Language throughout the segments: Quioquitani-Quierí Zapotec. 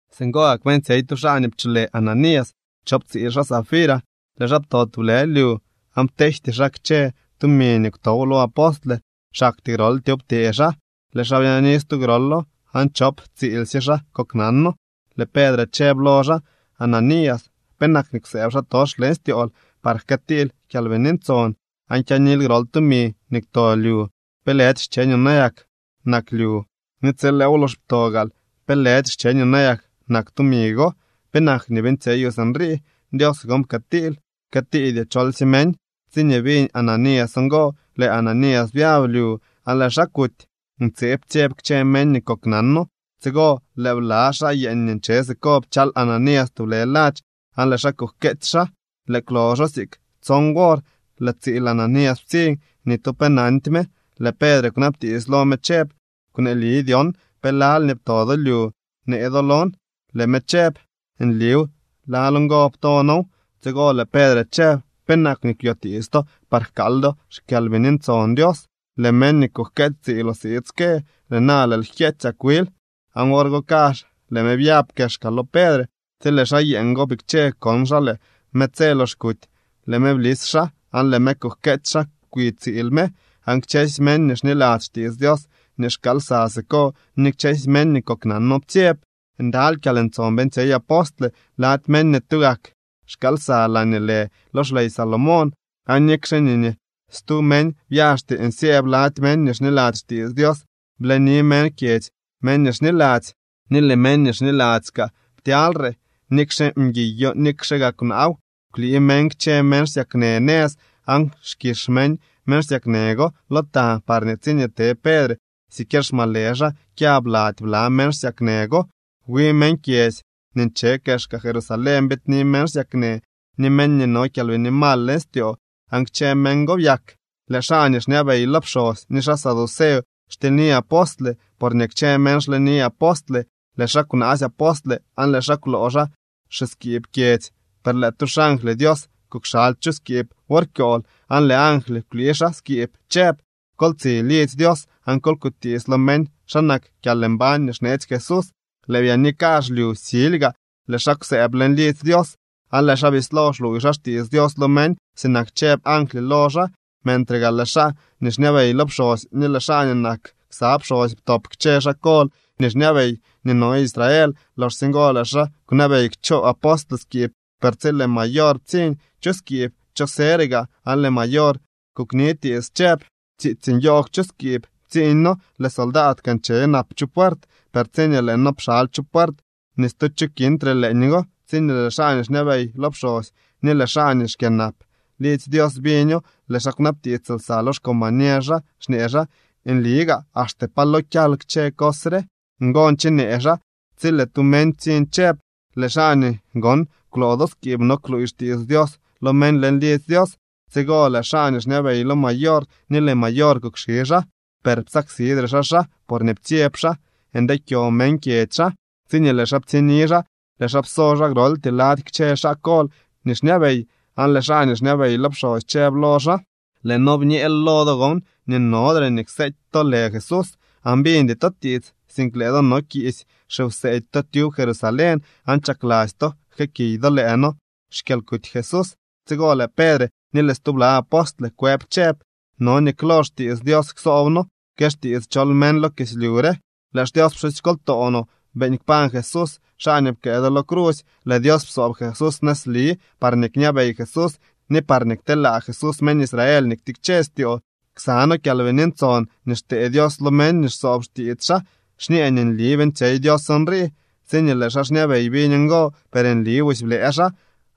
Singo gak beeñtsyey tu xaa nii pcholë Ananías chop tsiil xaa Safira. Lëë xaa pto tublë lyu, aan pteejty xaa kchë tumi nii kwtow lo apostle, xaktyee groltyeew ptee xaa. Lëë xaa byaani stu grolo, aan chop tsiilsye xaa koknano. Lëë Pedre chëb lo xaa: —Ananías, ¿penak nii kwsëëb xaatox leñ styool par jkëëtiil Kyalbini Ntson aan kyaanil grol tumi nii kwto lyu? ¿Pe lëdy xcheñoo nayak nak lyu? Ni tsi lëëw lox ptoo gaal, ¿pe lëdy xcheñoo nayak nak tumi go? ¿Penak nii beeñtsyeyoo sinrii? Dios gon pkëëtiil, pkëëtiidyoo cholsye meñ. Tsiñee biñ Ananías ngo, lëë Ananías byab lyu aan lëë xaa kuty. Ntseeb ptsyeb kchë meñ nii koknano. Tsigo lëë bla xaa yeeñ nii nche siko pchal Ananías tublë ladx aan lëë xaa kujkeetsy xaa. Lëë kwloxo siik tson wor, lëë tsiil Ananías ptsiñ. Ni tu pe nandy me. Lëë Pedre kwnabtiits lo me chëb: —Kwneeli dyon, ¿pe lal nii pto do lyu në do lon? Lëë me chëb: —Nliw, lal ngo pto noow. Tsigo lëë Pedre chëb: —¿Penak nii kwyotiits to par jkaal do xKyalbini Ntson Dios? Lëë meñ nii kujkeetsy tsiiloo siid ske. Lëë na lëël jkyeetsyak wil. Aan wor go kazh lëë me byab kexka lo Pedre. Tsi lëë xaa yeeñ go bikche kon xaa lëë me tse lox kuty, lëë me blis xaa aan lëë me kujkeetsy xaa kwi tsiil me. Aan kchësy meñ nii xniladzy xtiits Dios nii xkaal lsa siko ni kchësy meñ nii koknano ptsyeb. Ndaly kyalntson beeñtsyey apostle lady meñ nii tugak xkaal lsa laañee lë lo xley Salomón. Aan nikxe nii ni stu meñ byaxty nsyëëb lady meñ nii xniladzy xtiits Dios, bleni meñ kyedzy meñ nii xniladzy. Ni lëë meñ nii xniladzy kaa ptyalyre, nikxe mguiyo nikxe gaa kwnaaw. Kwlii meñ kchë meñ xsyaknë nëz aan xkix meñ meñ xsyaknë go lo ta parñee tsiñee te Pedre siquier xmalë xaa kyab lady bla meñ xsyaknë go. Wi meñ kyedzy nii nche kexka Jerusalén biidni meñ xsyaknë ni meñ nii no kyalbini mal leñ styoo aan kchë meñ go byak. Lëë xaa nii xñabey lo pxosy ni xaa saduceo xtilyni apostle porñee kchë meñ xleni apostle. Lëë xaa kwnaasy apostle aan lëë xaa kwloo xaa xiskiib kyedzy. Per lëë tu xangly Dios kukxaly chu skiib wor kyool aan lëë angly kwlii xaa skiib chëb: —Kol tsi lidzy Dios aan kol kutiits lo meñ xa nak kyalmbañ nii xneetsy Jesús. Lëë byaani kazh lyu silyga, lëë xaa kwsëëb leñ lidzy Dios aan lëë xaa bislo xluuy xaa xtiits Dios lo meñ sinak chëb angly lo xaa. Mentre gaa lëë xaa nii xñabey lo pxosy ni lëë xaa nii nak ksa pxosy ptop kchë xaa kol nii xñabey nii no Israel. Loxsye ngo lëë xaa kwnabey kchoo apostle skiib. Per tsi lëë mayor ptsiñ chu skiib, cho sëre gaa, aan lëë mayor kuknitiits, chëb: —Tsiitsy nyoogw chu skiib ptsiiñ noo, lëë soldaad kaa nche nap chu puert. Per tsiñee lëë noo pxaly chu puert, ni stu cho kintre leeñgo. Tsiñee lëë xaa nii xñabey lo pxosy ni lëë xaa nii xkyënap lidzy Dios biño, lëë xaa kwnabtiits lsa lo xcombañer xaa, xñee xaa: Nli gaa axte pa lo kyal kchë cos re. Ngo nchenee xaa tsi lëë tu meñ ptsiñ chëb: —Lëë xaa nii gon kwloo do skiib no kluuy xtiits Dios lo meñ leñ lidzy Dios. Tsigo lëë xaa nii xñabey lo mayor ni lëë mayor kukxi xaa, per psaksidre xaa xaa, porñee ptsyeb xaa ndeekyo meñ kyedzy xaa. Tsiñee lëë xaa ptsiñni xaa, lëë xaa pso xaa groltyee lady kchë xaa kol nii xñabey, aan lëë xaa nii xñabey lo pxosy chëb lo xaa: —Lëë noo bñeel lo do gon nii nodre nii kseety to lë Jesús. Aan biñdy to tiits, sink lëë do no kiisy xiwseedy to tyub Jerusalén, aan chakladzy to jkëëkiy do lëë noo xkyalkuty Jesús. Tsigo lëë Pedre ni lëë stubla apostle kwëb chëb: —No nii klo xtiits Dios ksoob noo que xtiits chol meñ lo kislyu re. Lëë xDios pxusykoltoo no beeñ kpañ Jesús, xaa nii pkëë do lo crusy. Lëë Dios psoob Jesús nëzli parñee kñabey Jesús ni parñee kteelaa Jesús meñ Israel nii ktikche styoo. Ksa noo Kyalbini Ntson nii xtee Dios lo meñ nii xsoob xtiits xaa xñee nii nli beeñtsyey Dios nrii. Tsiñee lëë xaa xñabey biñ ngo, per nli busy blëë xaa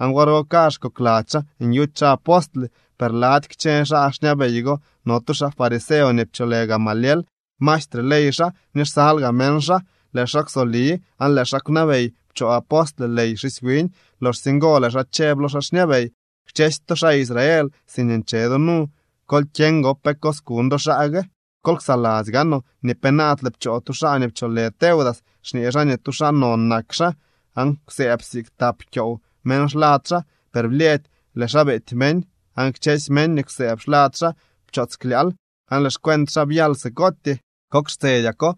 aan wor go kazh kokladzy xaa nyuty xaa apostle. Per lady kchë xaa xñabey go no tu xaa fariseo nii pcholë Gamaliel. Maestre ley xaa ni xsal gaa meñ xaa. Lëë xaa kwsoli aan lëë xaa kwnabey pchoo apostle ley xisy wiñ. Loxsye ngo lëë xaa chëb lo xaa xñabey: —Kchësy to xaa Israel, siñee nche do nu, kol kyeñ gon pe kuñ do xaa gue. Kol ksaladzy gaanoo nii penaadle pchoo tu xaa nii pcholë Teudas, xñee xaa nii tu xaa non nak xaa, aan kwsëëb siik tap kyoow meñ xlad xaa. Per blyëëdy lëë xaa beety meñ, aan kchësy meñ nii kwsëëb xlad xaa pchoots klyaal, aan lëë xcuent xaa byal sikootyee. Kok xtsedyako,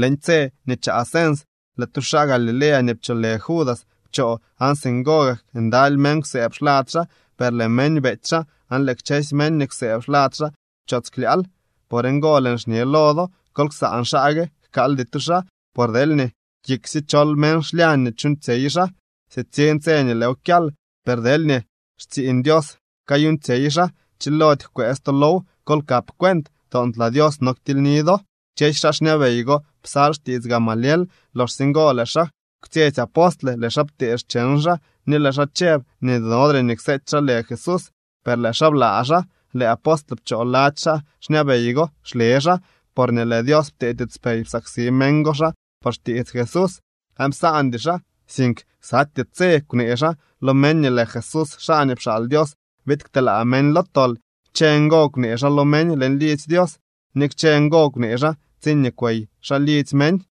leñ tse nii chaa cens, lëë tu xaa Galilea nii pcholë Judas pchoo, aan singo gak ndaly meñ kwsëëb xlad xaa, per lëë meñ beety xaa, aan lëë kchësy meñ nii kwsëëb xlad xaa pchoots klyaal. Por ngo lëën xñe lo do: Kol ksaan xaa gue, jkaaldy to xaa. Por deelñee kiksye chol meñ xlyañ nii chuuñtsyey xaa sitsiñ tse nii lëëw kyal. Per deelñee xtsiiñ Dios kayuuñtsyey xaa, chilody jkwëës to low. Kol kap cuent, toontlaa Dios no ktilyni do. Kchësy xaa xñabey go psal xtiits Gamaliel. Loxsye ngo lëë xaa kwtsyetsy apostle. Lëë xaa ptee xcheñ xaa ni lëë xaa chëb nii nodre nii kseety xaa lë Jesús, per lëë xaa blaa xaa. Lëë apostle pchoo lady xaa xñabey go xle xaa porñee lëë Dios ptee tiitspey psaksi meñ go xaa por xtiits Jesús. Aan psaandy xaa, sink ksatyee tse kwnee xaa lo meñ nii lëë Jesús xaa nii pxaal Dios biid kteelaa meñ lo tol. Kchë ngo kwnee xaa lo meñ leñ lidzy Dios ni kchë ngo kwnee xaa tsiñee kwey xaa lidzy meñ.